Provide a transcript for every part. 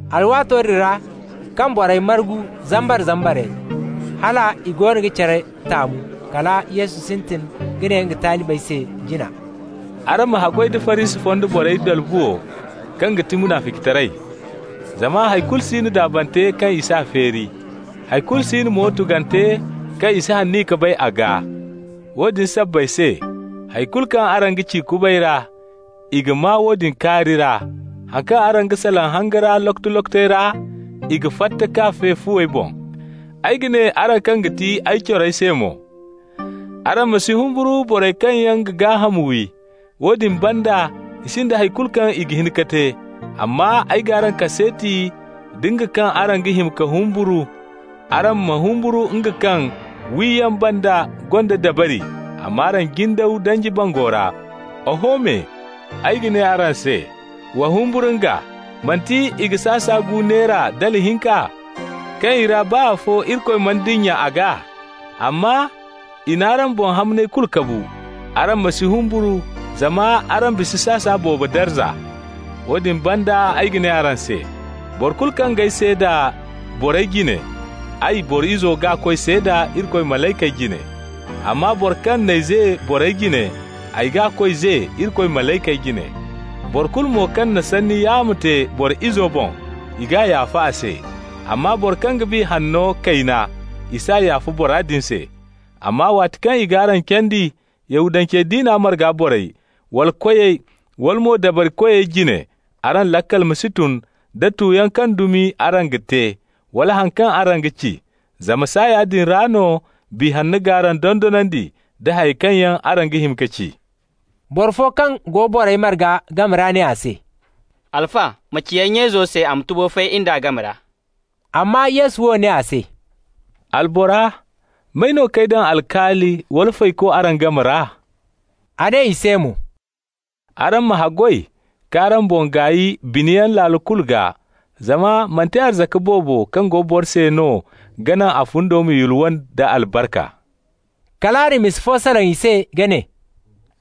Alwaato din ra, kaŋ borey margu zambar-zambarey, hal i goono ga care taamu, kala Yesu sintin ka ne nga talibey se jina: «Araŋ ma haggoy da Farisi fonda borey dalbuwo, kaŋ ga ti munaficitaray. Zama hay kulu si no daabante kaŋ i s'a feeri. Hay kulu si no mo tugante kaŋ i si aniya ka bay a gaa. Woodin sabbay se, hay kulu kaŋ araŋ ci kubay ra, i ga maa woodin kaari ra. Haŋ kaŋ araŋ ga salaŋ hanga ra lokoto-lokotey ra, i ga fatta k'a fe fuwey boŋ. Ay ga ne araŋ kaŋ ga ti ay corey se mo: araŋ ma si humburu borey kaŋ yaŋ ga gaaham wi, woodin banda i sinda hay kulu kaŋ i ga hin ka te. Amma ay g'araŋ kaseeti da nga kaŋ araŋ ga hima ka humburu. Araŋ ma humburu nga kaŋ, wiyaŋ banda, gonda dabari a m'araŋ jindaw danji bango ra. Oho me, ay ga ne araŋ se: wa humburu nga. Manti i ga sasa gu neera dala hinka? Kaŋ i ra baa afo Irikoy mana dinya a gaa. Amma, i n'araŋ boŋ hamney kulu kabu. Araŋ ma si humburu, zama araŋ bisa sasa boobo darza! Woodin banda ay ga ne araŋ se: boro kulu kaŋ g'ay seeda borey jine, ay, Boro Izo g'a koy seeda Irikoy malaykey jine. Amma boro kaŋ n'ay ze borey jine, ay g'a koy ze Irikoy malaykey jine. Boro kulu mo kaŋ na sanni yaamo te Boro Izo boŋ, i g'a yaafa a se. Amma boro kaŋ ga Biya Hanna kayna, i s'a yaafa bora din se. Amma waati kaŋ i g'araŋ candi Yahudance diina marga borey, wala koyey, wala mo dabarikoyey jine, araŋ laakal ma si tun da tuyaŋ kaŋ dumi araŋ ga te, wala haŋ kaŋ araŋ ga ci. Zama saaya din ra no Biya Hanno g'araŋ dondonandi nda hayey kaŋ yaŋ araŋ ga hima ka ci.» Boro fo kaŋ go borey marga game ra ne a se: «Alfa, ma ci ay nya izo se a ma tubo fay in d'a game ra.» Amma Yesu wo ne a se: «Albora, may no k'ay daŋ alkaali wala fayko araŋ game ra?» A ne i se mo: «Araŋ ma haggoy k'araŋ boŋ gaay biniyaŋ laalo kulu gaa, zama manti arzaka boobo kaŋ go boro se no ga naŋ a fundo ma yulwa nda albarka.» Kal a na misa fo salaŋ i se ka ne: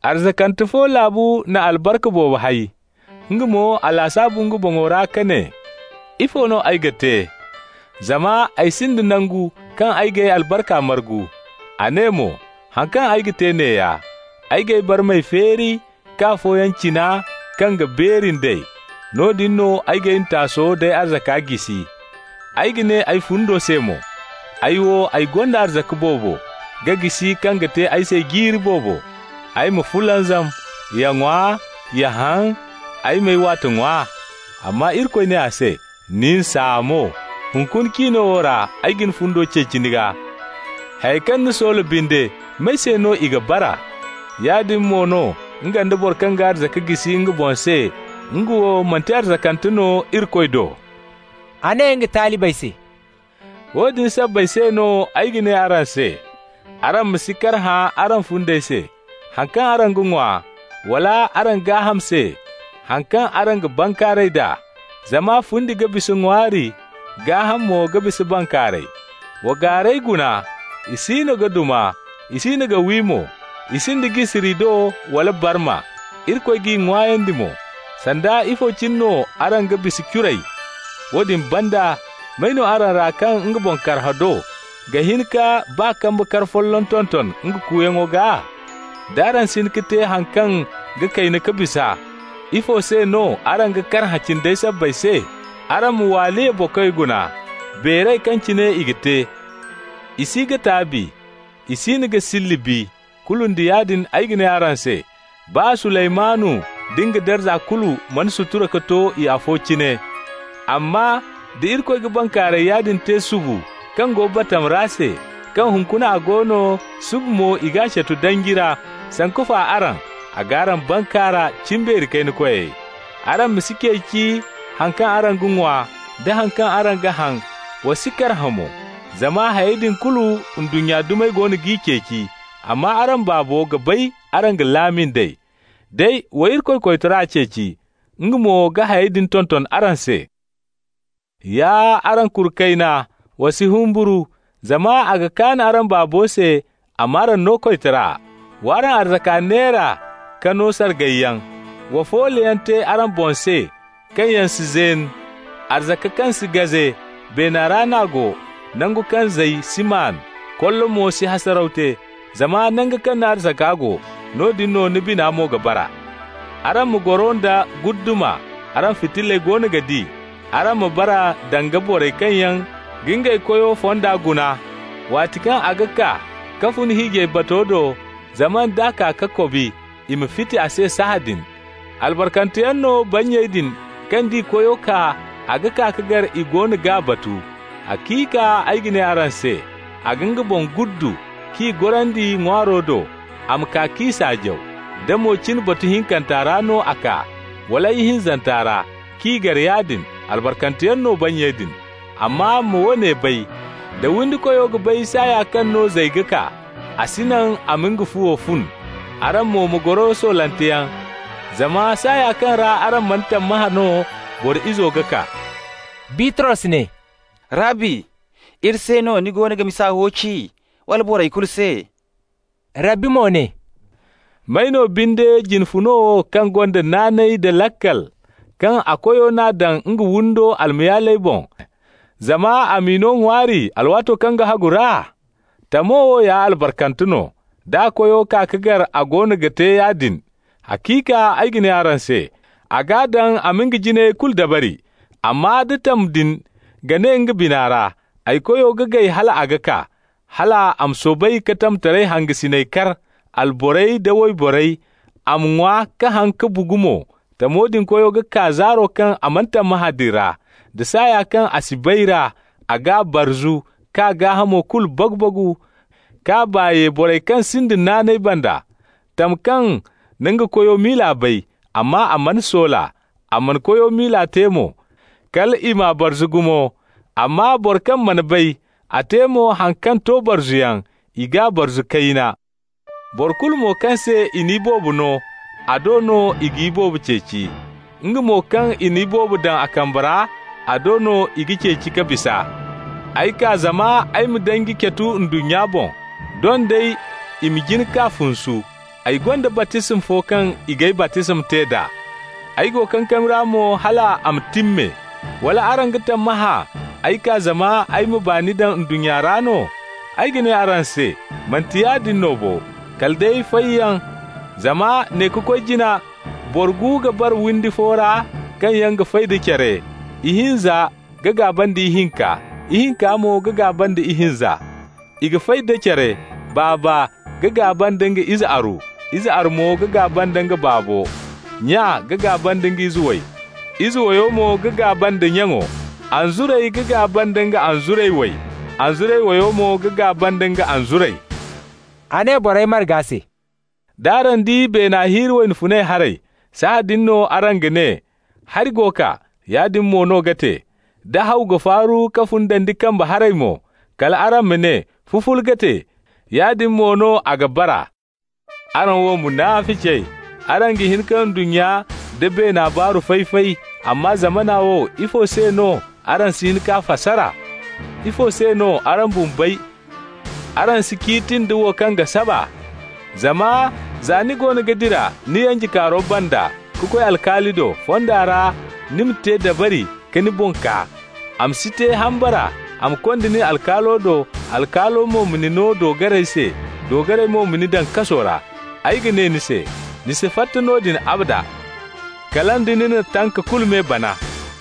«Arzakante fo laabu na albarka boobo hay. Nga mo, a lasaabu nga boŋo ra ka ne: ‹Ifo no ay ga te? Zama ay sinda nangu kaŋ ay g'ay albarka margu.› A ne mo: ‹Haŋ kaŋ ay ga te neeya: ay g'ay barmey feeri ka afooyaŋ cina kaŋ ga beeri nd'ey. Noodin no ay g'ay ntaaso d'ay arzaka jisi. Ay ga ne ay fundo se mo: Ay wo, ay gonda arzaka boobo ga jisi kaŋ ga te ay se jiiri boobo. Ay ma fulanzam, ya ŋwa, ya haŋ, ay m'ay waate ŋwa.› Amma Irikoy ne a se: ‹Nin saamo! Hunkuna cino wo ra ay ga ni fundo ceeci ni gaa. Hayey kaŋ ni soola binde, may se no i ga bara?› Yaadin mo no nga nda boro kaŋ ga arzaka jisi nga boŋ se, nga wo manti arzakante no Irikoy do.» A ne nga talibey se: «Woodin sabbay se no ay ga ne araŋ se: araŋ ma si karhã araŋ fundey se, haŋ kaŋ araŋ ga ŋwa, wala araŋ gaaham se, haŋ kaŋ araŋ ga bankaaray d'a. Zama fundi ga bisa ŋwaari, gaahamo mo ga bisa bankaaray. Wa gaarey guna. I siino ga duma, i siino ga wi mo, i sinda jisiri do wala barma. Irikoy g'i ŋwaayandi mo. Sanda ifo cine no araŋ ga bisa curey! Woodin banda, may no araŋ ra kaŋ nga boŋ karhã do ga hin ka baa kambe kar folloŋ tonton nga kuuyaŋo gaa? D'araŋ si hin ka te haŋ kaŋ ga kayna ka bisa, ifo se no araŋ ga karhã cindey sabbay se? Araŋ ma waaliya bokey guna, beeray kaŋ cine i ga te. I si ga taabi, i siino ga silli bi. Kulu nda yaadin ay ga ne araŋ se: baa Suleymanu nda nga darza kulu mana sutura ka to i afo cine. Amma da Irikoy ga bankaaray yaadin te subu kaŋ go batama ra se, kaŋ hunkuna a go no, suba mo i g'a catu danji ra, sanku fa araŋ, a g'araŋ bankaara, cimbeeri kayna koyey. Araŋ ma si ceeci haŋ kaŋ araŋ ga ŋwa da haŋ kaŋ araŋ ga haŋ, wa si karhã mo. Zama hayey din kulu, ndunnya dumey goono g'i ceeci, amma araŋ Baabo ga bay araŋ ga laami nd'ey. Day wa Irikoy koytara ceeci, nga mo ga hayey din tonton araŋ se. Ya araŋ kuru kayna, wa si humburu! Zama a ga kaan araŋ Baabo se a m'araŋ no koytara. Wa araŋ arzaka neera ka no sargayyaŋ. Wa fooloyaŋ te araŋ boŋ se kaŋ yaŋ si zeen, arzaka kaŋ si gaze. Beena ra n'a go, nangu kaŋ zay si maan, kollo mo si hasaraw te. Zama nango kaŋ ni arzaka go, noodin no ni bina mo ga bara. Araŋ ma goro nda guddama, araŋ fitilley goono ga di. Araŋ ma bara danga borey kaŋ yaŋ ga ngey koyo fonda guna, waati kaŋ a ga kaa ka fun hiijay bato do, zama d'a kaa ka kobi, i ma fiti a se sahãadin. Albarkanteyaŋ no bannyey din kaŋ d'i koyo kaa, a ga kaa ka gar i goono g'a batu. Haciika ay ga ne araŋ se: a ga nga boŋ guddu, k'i gorandi ŋwaaro do, a ma kaa k'i saajaw. Da mo cin batu hinkanta ra no a kaa, wala ihinzanta ra, k'i gar yaadin, albarkanteyaŋ no bannyey din. Amma ma woone bay: da windikoyo ga bay saaya kaŋ no zay ga kaa, a si naŋ i ma nga fuwo fun. Araŋ mo ma goro soolanteyaŋ, zama saaya kaŋ ra araŋ mana tammahã no Boro Izo ga kaa.» Bitros ne: «Rabbi, iri se no ni goono ga misa wo ci, wala boro kulu se?» Rabbi mo ne: «May no binde jine funo wo kaŋ gonda naanay da laakal, kaŋ a koyo n'a daŋ nga windo almayaaley boŋ, zama a m'i no ŋwaari alwaato kaŋ ga hagu ra? Tamo wo ya albarkante no, d'a koyo kaa ka gar a goono ga te yaadin. Haciika ay ga ne araŋ se: a g'a daŋ a ma nga jinayey kulu dabari. Amma da tam din ga ne nga bina ra: ‹Ay koyo ga gay hal a ga kaa,› hal a ma soobay ka tamtaray hangasiney kar, alborey da wayborey, a ma ŋwa ka haŋ ka bugu mo. Tamo din koyo ga kaa zaaro kaŋ a mana tammahã din ra, da saaya kaŋ a si bay ra. A g'a barzu k'a gaahamo kulu bagu-bagu k'a baa ye borey kaŋ sinda naanay banda. Tam kaŋ na nga koyo miila bay, amma a mana soola, a mana koyo miila te mo, kal i m'a barzu gumo. Amma boro kaŋ mana bay, a te mo haŋ kaŋ to barzuyaŋ, i g'a barzu kayna. Boro kulu mo kaŋ se i na iboobo no, a do no i ga iboobo ceeci. Nga mo kaŋ i na iboobo daŋ a kambe ra, a do no i ga ceeci ka bisa. Ay kaa zama ay ma danji catu ndunnya boŋ. Doŋ day i ma jin k'a funsu! Ay gonda baptisma fo kaŋ i g'ay baptisma te d'a. Ay go kankami ra mo hal a ma timme. Wala araŋ ga tammahã ay kaa zama ay ma baani daŋ ndunnya ra no? Ay ga ne araŋ se: manti yaadin no bo, kala day fayyaŋ. Zama ne ka koy jina boro gu ga bara windi fo ra kaŋ yaŋ ga fay da care. Ihinza ga gaaba nda ihinka, ihinka mo ga gaaba nda ihinza. I ga fay da care: baaba ga gaaba nda nga ize aru, ize aro mo ga gaaba nda baabo. Nya ga gaaba nda ize way, ize wayo mo ga gaaba nda nyaŋo. Anzuray ga gaaba nda nga anzuray way, anzuray wayo mo ga gaaba nda nga anzuray.» A ne borey marga se: «D'araŋ di beena hirri wayna funay haray, sahãadin no araŋ ga ne: ‹Hari go kaa,› yaadin mo no ga te. Da haw ga faaru ka fun dandi kambe haray mo, kal araŋ ma ne: ‹Fufule ga te,› yaadin mo no a ga bara. Araŋ wo munaficey! Araŋ ga hin ka ndunnya nda beena baaru fay-fay, amma zamana wo, ifo se no araŋ si hin k'a fasara? Ifo se no araŋ bumbey, araŋ si ciiti nda wo kaŋ ga saba? Zama za ni goono ga dira ni yanjekaaro banda ka koy alkaali do, fonda ra ni ma te dabari ka ni boŋ kaa. A ma si te hambara a ma konda nin alkaalo do, alkaalo mo ma ni no doogarey se, doogarey mo ma ni daŋ kaso ra. Ay ga ne ni se: ni si fatta noodin abada, kala nda ni na tanka kulu me bana.»